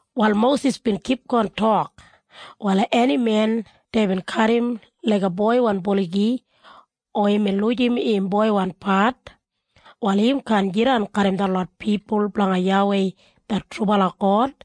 Wal Mosis bin kipgon tok, “Wal eni men deibin kadim laiga boiwan buligi, o imbin lujim im boiwan pat, wal im kaan jidan garram detlot pipul blanga YAWEI det trubala God.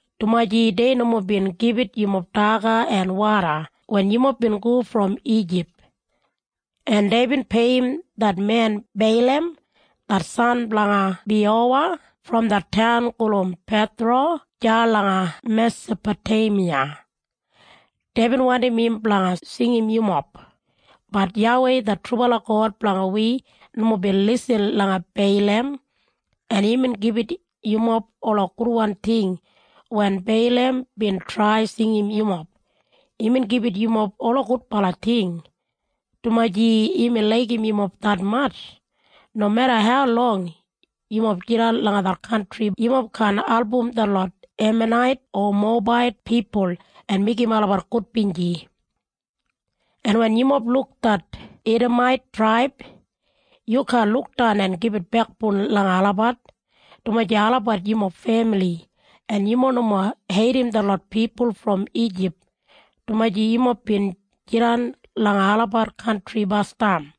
dumaji dei nomo bin gibit yumob daga en woda wen yumob bin go brom Ijip. En deibin peiyim det men Beilam det san blanga Biyowa brom det taun gulum Pethora deya langa Mesapoteimiya. Deibin wandim im blanga singim yumob. Bat YAWEI det trubala God blanga wi nomo bin lisin langa Beilam en imbin gibit yumob ola gudwan ting wen Beilam bin trai singim yumob. Imbin gibit yumob ola gudbala ting, dumaji imbin laigim yumob detmatj. Nomeda haulong yumob jidan langa det kantri yumob kaan album detlot Emanait o Mowebait pipul en meigim olabat gudbinji. “En wen yumob luk det Idamait traib yu kaan lukdan en gibit bekboun langa olabat, dumaji olabat yumob femili. En yumob nomo heidim detlot pipul brom Ijip, dumaji yumob bin jidan langa olabat kantri basdam.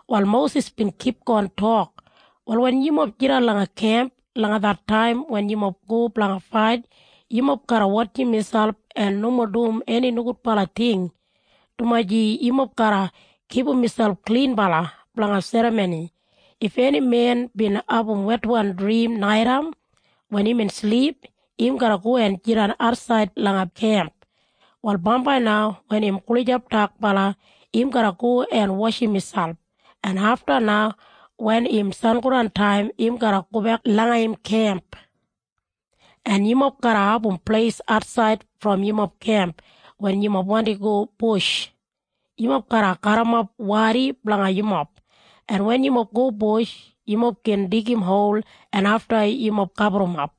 Wal Mosis bin kipgon tok, “Wal wen yumob jidan langa kemp langa det taim wen yumob go blanga fait, yumob garra wotjim miselp en nomo dum eni nogudbala ting, dumaji yumob garra kipum miselp klinbala blanga serramoni. If eni men bin abum wetwan drim naitaim wen imbin silip, im garra go en jidan atsaid langa kemp. Wal bambai na wen im gulijap dakbala im garra go en washim miselp, en afta na wen im sangodantaim im garra gobek langa im kemp. “En yumob garra abum pleis atsaid brom yumob kemp wen yumob wandim go bush. Yumob garra garrimap wadi blanga yumob, en wen yumob go bush, yumob gin digim hol en afta yumob gaburrumap.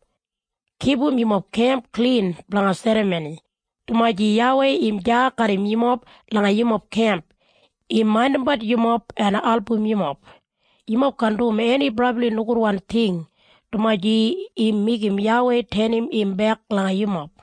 Kipum yumob kemp klin blanga serramoni, dumaji YAWEI im deya garram yumob langa yumob kemp. Im maindimbat yumob en album yumob. Yumob kaan dum eni brabli nogudwan ting, dumaji im meigim YAWEI tenim im bek langa yumob.”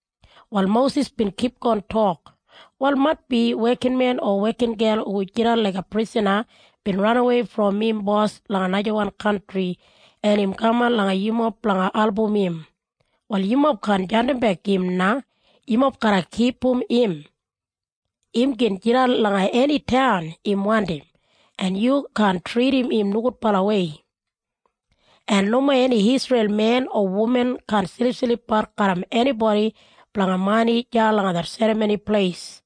Wal Mosis bin kipgon tok, “Wal maitbi wekinmen o wekingel hu jidan laiga prisana bin ranawei brom im bos langa najawan kantri en im kaman langa yumob blanga album im. Wal yumob kaan jandimbek im na. Yumob garra kipum im. Im gin jidan langa eni taun im wandim, en yu kaan tridim im nogudbalawei. “En nomo eni Isreil men o wuman kaan silipsilipbat garram enibodi blanga mani deya langa det Serramoni Pleis.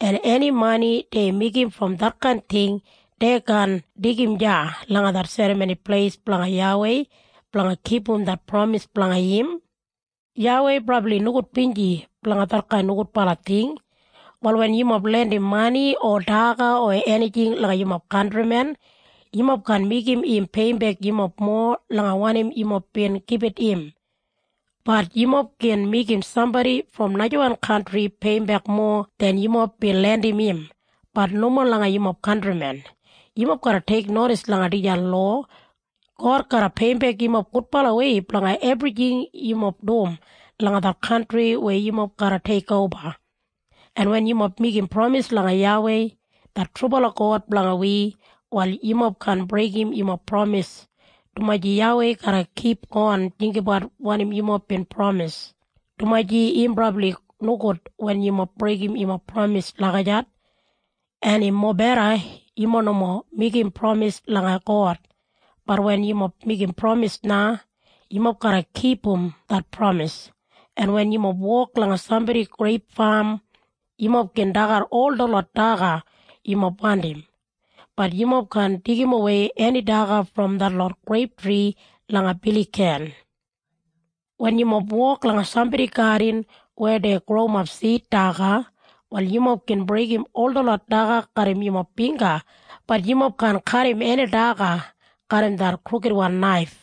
En eni mani dei meigim brom detkain ting dei kaan deigim deya langa det Serramoni Pleis blanga YAWEI blanga kipum det pramis blanga im. YAWEI brabli nogudbinji blanga detkain nogudbala ting. “Wal wen yumob lendim mani o daga o enijing langa yumob kantrimen, yumob kaan meigim im peiyimbek yumob mowa langa wanim yumob bin gibit im. Bat yumob gin meigim sambodi brom najawan kantri peiyimbek mowa den yumob bin lendim im, bat nomo langa yumob kantrimen. Yumob garra teiknodis langa dijan lowa. God garra peiyimbek yumob gudbalawei blanga ebrijing yumob dum langa det kantri weya yumob garra teikoba. “En wen yumob meigim pramis langa YAWEI det trubala God blanga wi, wal yumob kaan breigim yumob pramis, dumaji YAWEI garra kipgon jinggabat wanim yumob bin pramis, dumaji im brabli nogud wen yumob breigim yumob pramis lagijat. En im mobeda yumob nomo meigim pramis langa God. Bat wen yumob meigim pramis na, yumob garra kipum det pramis. “En wen yumob wok langa sambodi greip fam, yumob gin dagat ol detlot daga yumob wandim, bat yumob kaan deigimwei eni daga brom detlot greip tri langa biligan. Wen yumob wok langa sambodi gadin weya dei growimap sid daga, wal yumob gin breigim ol detlot daga garram yumob bingga, bat yumob kaan kadim eni daga garram det krukidwan naif.”